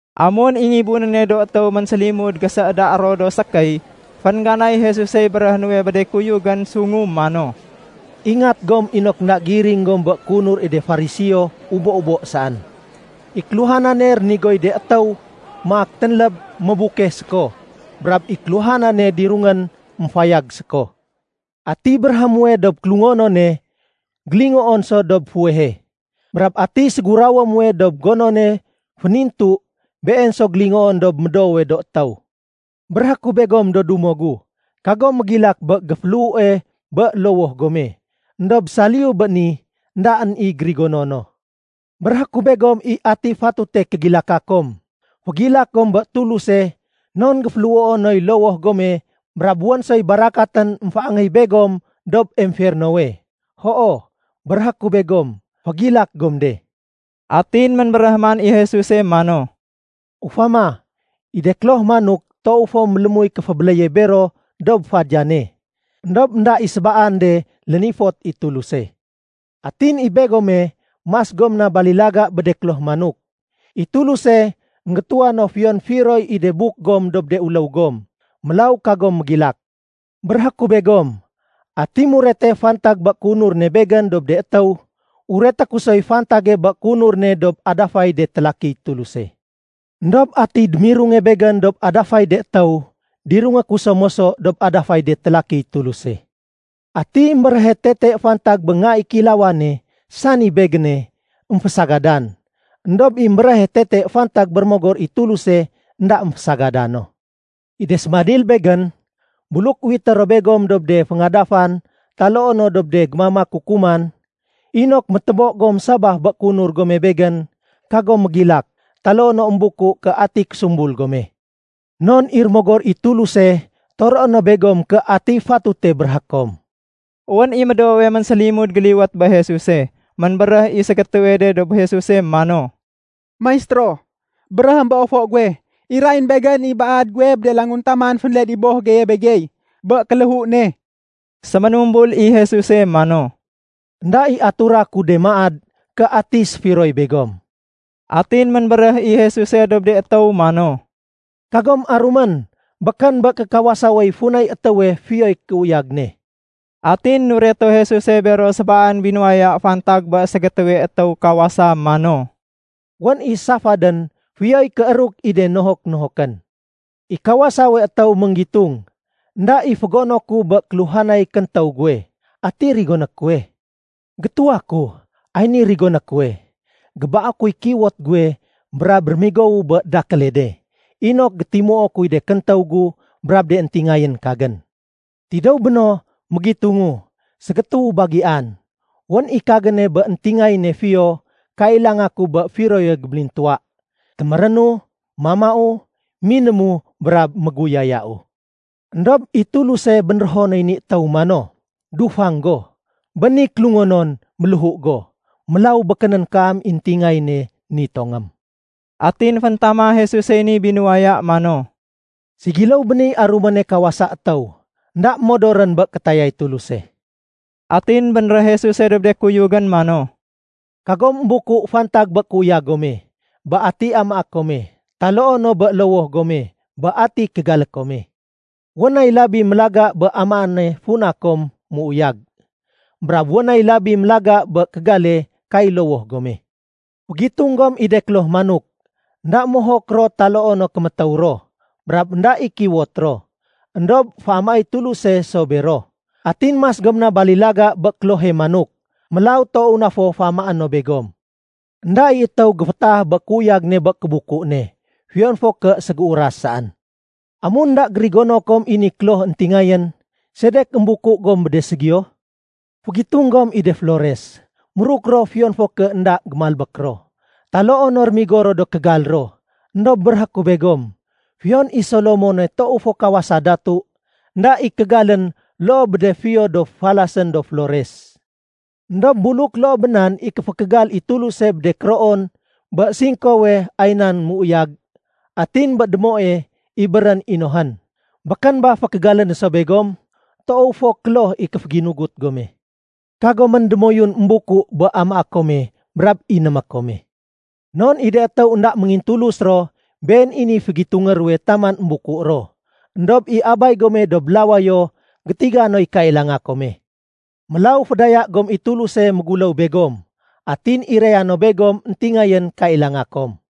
Amun i ngibunéne do étéw ménsélimud gésééda ro do sékéy, féngganay Jesusey béréhé nuwe bé de kuyugén sungu mano, “Ingat gom inok énda miring gom bé kéunur i de Fariseo ubo-ubo saén. I kéluhanane rénigoy de étéw maak ténléb, mébukeh séko. Brab i kéluhanane dirungén, émfayag séko. Atiy béréhé muwe dob kélungonone, gélingoon so dob fuwehe. Brab atiy ségurawé muwe dob gonone fénintu, been so gélingoon dob médoowe do étéw. “Béréhé ku begom do dumo gu, kagom mégilak bé géféléhue bé lowoh gome, éndob saliyu bé ni éndaén i gérigono no. Béréhé ku begom i ati fatute kégilaka kom. Fégilak gom bé Tuluse non géféléhuo noy lowoh gome brab wén soy barakatén émféangéy begom dob emfernowe. Hoo, béréhé ku begom fégilak gom de.” Atin ménbéréh man i Jesuse mano, “Ufama, i de kloh manok toow fo mélémuy kéfébéléye bero dob fadiyane. Endob énda i sébaan de lénifot i Tuluse. Atin i begome mas gom na balilaga bé de kloh manok. I Tuluse énggétuwa no fiyon firoy i de buk gom dob de uléw gom. Mélaw kagom mégilak. “Béréhé ku begom, ati murete fantag bé kéunur ne Begén dob de étéw, ureté ku soy fantage bé kéunur ne dob adafay de télakiy Tuluse. Endob atiy démirunge Begén dob adafay de étéw, dirungé ku so moso dob adafay de télakiy Tuluse. “Atiy émbéréhe tete fantag bé Nga i Kéilawane, sani Begéne, émfésagadan. Endob i émbéréhe tete fantag bé Rémogor i Tuluse énda émfésagada no. “I de sébanil Begén, buluk uwité ro begom dob de féngadafan taloo no dob de gémamak kukuman, inok métébo gom sabaf bé kéunur gome Begén, kagom mégilak taloo no émbuku ké ati késumbul gome. Non i Rémogor i Tuluse toroé no begom ké atiy fatute béréhé kom.” Wén i médoowe ménsélimud géliwét bé Jesuse. Ménbéréh i ségétéwe de dob Jesuse mano, “Maistéro, béréhém bé ofo guwe, irayén begén i baad guwe bé de languntaman fénled i boh geye begey bé kéléhu ne.” Séménumbul i Jesuse mano, “Enda i atura ku de maad ké ati séfiroy begom.” Atin ménbéréh i Jesuse dob de étéw mano, “Kagom arumén! Békén bé kékawasawey funay étéwe fiyoy kéuyag ne.” Atin nureto Jesuse bero sébaan binuwaya fantag bé ségétéwe étéw kawasa mano, “Wén i safadén, fiyoy kééruk i de nohok-nohokén. I kawasawe étéw ménggitung, ‘Enda i fégono ku bé kéluhanay kéntéw guwe. Ati rigoné kuwe? Gétuwa ku, ay ni rigoné kuwe. Gébaé kuy kiwot guwe, brab rémigowu bé dakéle de, inok gétimuo kuy de kéntéw gu brab de éntingayén kagén. Tidéw béno, mégitungu, Ségétéwu bagian. Wén i kagéne bé éntingayéne fiyo kailanga ku bé firoye gébélintuwa. Témérénu. Mamau, minému, brab méguyayau.’ Endob i Tuluse bénrého noy ni étéw mano, ‘Dufang go! Bé ni kélungonon, méléhu go. Mélaw békénén kaam i éntingayéne nitongém.’” Atin féntama Jesusey ni binuwaya mano, “Ségiléw bé niy aruméne kawasa étéw énda modorén bé kétayay Tuluse.” Atin bénréh Jesuse dob de kuyugén mano, “Kagom émbuku fantag bé kéuyag gome, bé ati amaé kome, taloo no bé lowoh gome, bé ati kégalé kome. Wén nay labi mélaga bé amaéne funa kom méuyag, brab wén nay labi mélaga bé kégale kay lowoh gome. Fégitung gom i de kloh manok. Enda mohok ro taloo no kémétéw ro, brab énda i kiwot ro. Endob féamaéy Tuluse so bero. Atin mas gom na balilaga bé klohe manok. Mélaw toow na fo féamaé no begom. Enda i étéw géfétaah bé kéuyag ne bé kébuku ne, fiyon fo ké ségéuras saén. Amun énda gérigono kom i ni kloh éntingayén, sedek émbuku gom bé de ségiyo? Fégitung gom i de flores. Méruk ro fiyon fo ké énda gémalbék ro, taloo no rémigo ro do kégal ro. Endob béréhé ku begom, fiyon i Solomone toow fo kawasa datu, énda i kégalén loo bé de fiyo do falasén do flores. Endob buluk loo bé nan i kéfékégal i Tuluse bé de kéroon bé singkowe ay nan méuyag, atin bé démoe ibérén inohén, békén ba fékégalé no so begom? Toow fo kloh i kéféginugut gome. Kagomén démoyun émbuku bé amaé kome brab inémé kome. Non i de étéw énda méngintulus ro, been i niy fégitungé ruwe taman émbuku ro. Endob i Abay gome dob lawayo gétiga noy kailanga kome. Mélaw fédaya gom i Tuluse méguléw begom, atin iraya no begom éntingayén kailanga kom.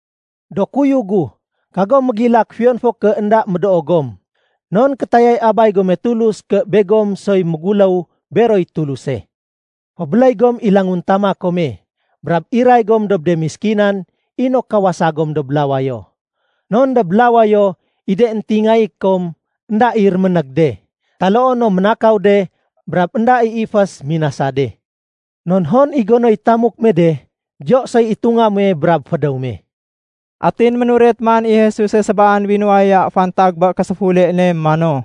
“Do kuyug gu, kagom mégilak fiyon fo ké énda médoo gom, non kétayay Abay gome Tulus ké begom soy méguléw beroy Tuluse. Fébéléy gom i languntama kome, brab iray gom dob de méskinan inok kawasa gom dob lawayo. Non dob lawayo, i de éntingayé kom énda i réménég de, taloo no ménakaw de, brab énda i ifés minasa de. Non hon i gonoy tamuk me de, diyo soy itunga muwe brab fédéw me.” Atin ménuret man i Jesuse sébaan binuwaya fantag bé késéfule ne mano,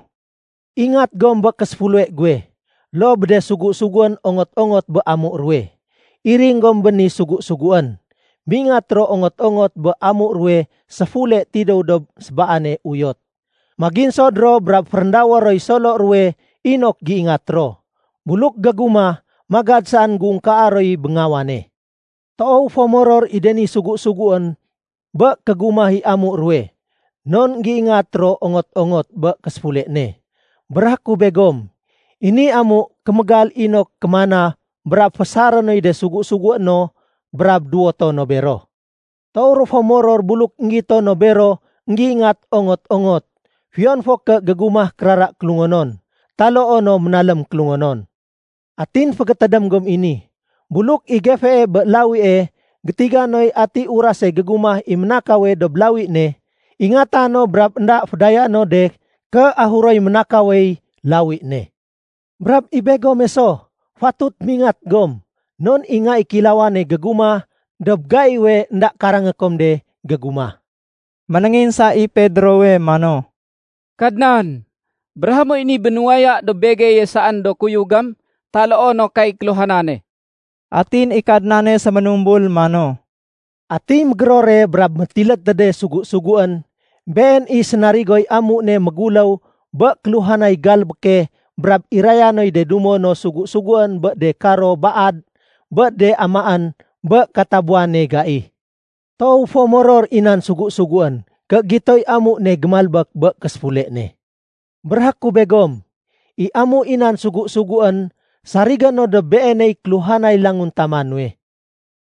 “Ingat gom bé késéfule guwe loo bé de sugu-suguén ongot-ongot bé amu ruwe. Iring gom bé de ni sugu-suguén, mingat ro ongot-ongot bé amu ruwe séfule tidéw dob sébaane uyot. Maginsod ro, brab féréndawé roy solo ruwe inok géingat ro. Buluk gégumah, magad saén géungkaa roy béngawane. Toow fo moror i de ni sugu-suguén bé kégumah i amu ruwe, non énggéingat ro ongot-ongot bé késéfule ne. Béréhé ku begom, i ni amu kémégal inok kémana brab fésaré noy de sugu-sugué no brab duwoto no bero. Toow ro fo moror buluk énggito no bero énggéingat ongot-ongot fiyon fo ké gégumah kérara kélungonon, taloo no ménalém kélungonon. Atin fégétédém gom i ni, buluk i gefee bé lawie gétiga noy ati urase gégumah i ménakawe dob lawi ne, ingata no brab énda fédayaé no de ké ahuroy ménakawey lawi ne. Brab i begome so, fatut mingat gom non i Nga i Kéilawane gégumah dob gaiwe énda karangé kom de gégumah.” Ménénginsa i Pedrowe mano, “Kadnan, béréhé moy ni binuwaya dob begeye saén do kuyugém, taloo no kay kéluhanane?” Atin i Kadnane séménumbul mano, “Atiy mégérore brab métilédtéde sugu-suguén, been i sénarigoy amu ne méguléw bé kéluhanay galbéke brab iraya noy de dumo no sugu-suguén bé de karo baad bé de amaén bé katabuwane gai. Toow fo méoror i nan sugu-suguén ké gitoy amu ne gémalbék bé késéfule ne. Béréhé ku begom, i amu i nan sugu-suguén sarigé no dob beeney kéluhanay languntama nuwe.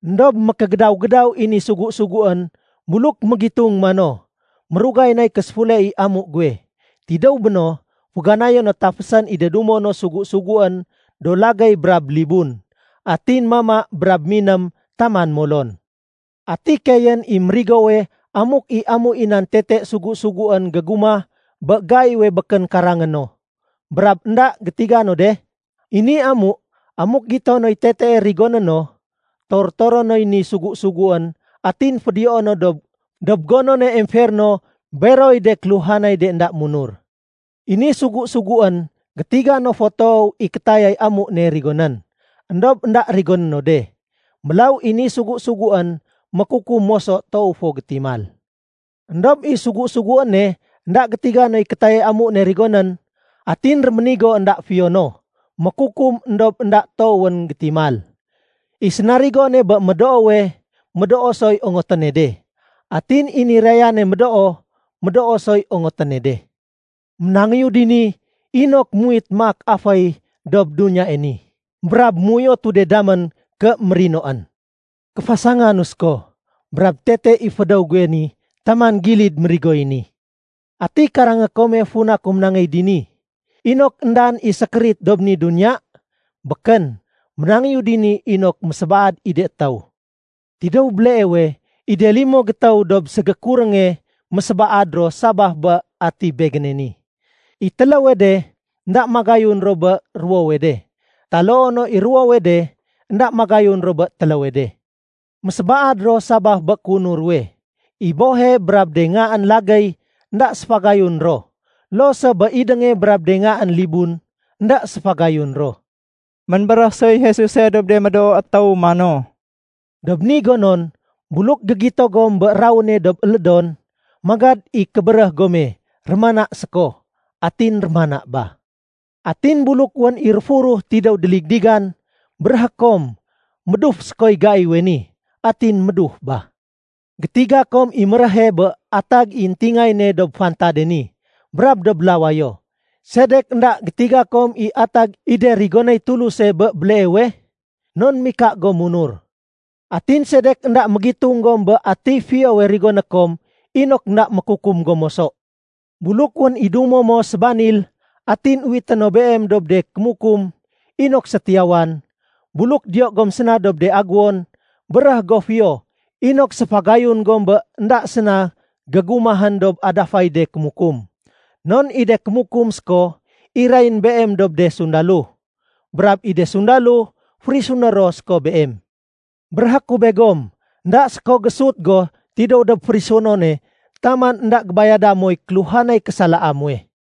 Endob mékégédaw-gédaw i ni sugu-suguén buluk mégitung mano, ‘Mérugay nay késéfule i amu guwe.’ Tidéw béno, féganayé no tafésén i de dumo no sugu-suguén do lagéy brab libun, atin mama brab miném taman molon. Ati keeyén i mérigowe amuk i amu i nan tete sugu-suguén gégumah bé gaiwe békén karangé no, brab énda gétiga no de? I ni amu, amuk gito noy tetee rigoné no, tor-toré noy ni sugu-suguén atin fédiyoé no dob gonone emferno beroy de kéluhanay de énda munur. “I ni sugu-suguén gétiga no fo toow i kétayay amu ne rigonén, éndob énda rigoné no de. Mélaw i ni sugu-suguén mékukum moso toow fo gétimal. Endob i sugu-suguéne énda gétiga noy kétayay amu ne rigonén, atin réménigo énda fiyo no, mékukum éndob énda toowén gétimal. I sénarigone bé médoowe, médoo soy ongoténe de. Atin i nirayane médoo, médoo soy ongoténe de. “Ménangéyu dini inok muwit maak aféy dob duniyae ni, brab méuyotu de damén ké mérinoén. Kéfasanganu séko, brab tete i fédéw guwe ni taman gilid mérigoy ni. Ati karangé kome funa ku ménangéy dini? Inok éndaén i sékérit dob ni duniya? Békén. Ménangéyu dini inok mésébaad i de étéw. Tidéw béleewe, i de limo gétéw dob ségékurénge, mésébaad ro sabaf bé ati Begéne ni. I téléwe de énda magayun ro bé ruwowe de, taloo no i ruwowe de énda magayun ro bé téléwe de. Mésébaad ro sabaf bé kéunur ruwe. I bohe brab de ngaén lagéy énda séfagayun ro. Loo so bé idénge brab de ngaén libun, énda séfagayun ro.” Ménbéréh soy Jesuse dob de médoo étéw mano, “Dob ni gonon, buluk gégito gom bé rawéne dob élédon, magad i kébéréh gome, ‘Rémana séko.’ Atin rémana ba. Atin buluk wén i réfuruh tidéw déligdigan, béréhé kom, ‘Méduf sékoy gaiwe ni.’ Atin méduf ba. Gétiga kom i méréhe bé atag i éntingayéne dob fantade ni brab dob lawayo. Sedek énda gétiga kom i atag i de rigonéy Tuluse bé béleewe? Non mika gom munur. “Atin sedek énda mégitung gom bé atiy fiyowe rigoné kom inok énda mékukum gom moso? Buluk wén i dumo mo sébanil, atin uwité no beem dob de kémukum inok sétiyawan, buluk diyo gom séna dob de agéwon, béréh go fiyo inok séfégayun gom bé énda séna gégumahén dob adafay de kémukum. Non i de kémukum séko irayén beem dob de sundalo, brab i de sundalo férisuné ro séko beem. Béréhé ku begom, énda séko géésut go tidéw dob férisunone taman énda gébayada moy kéluhanay késalaa muwe.”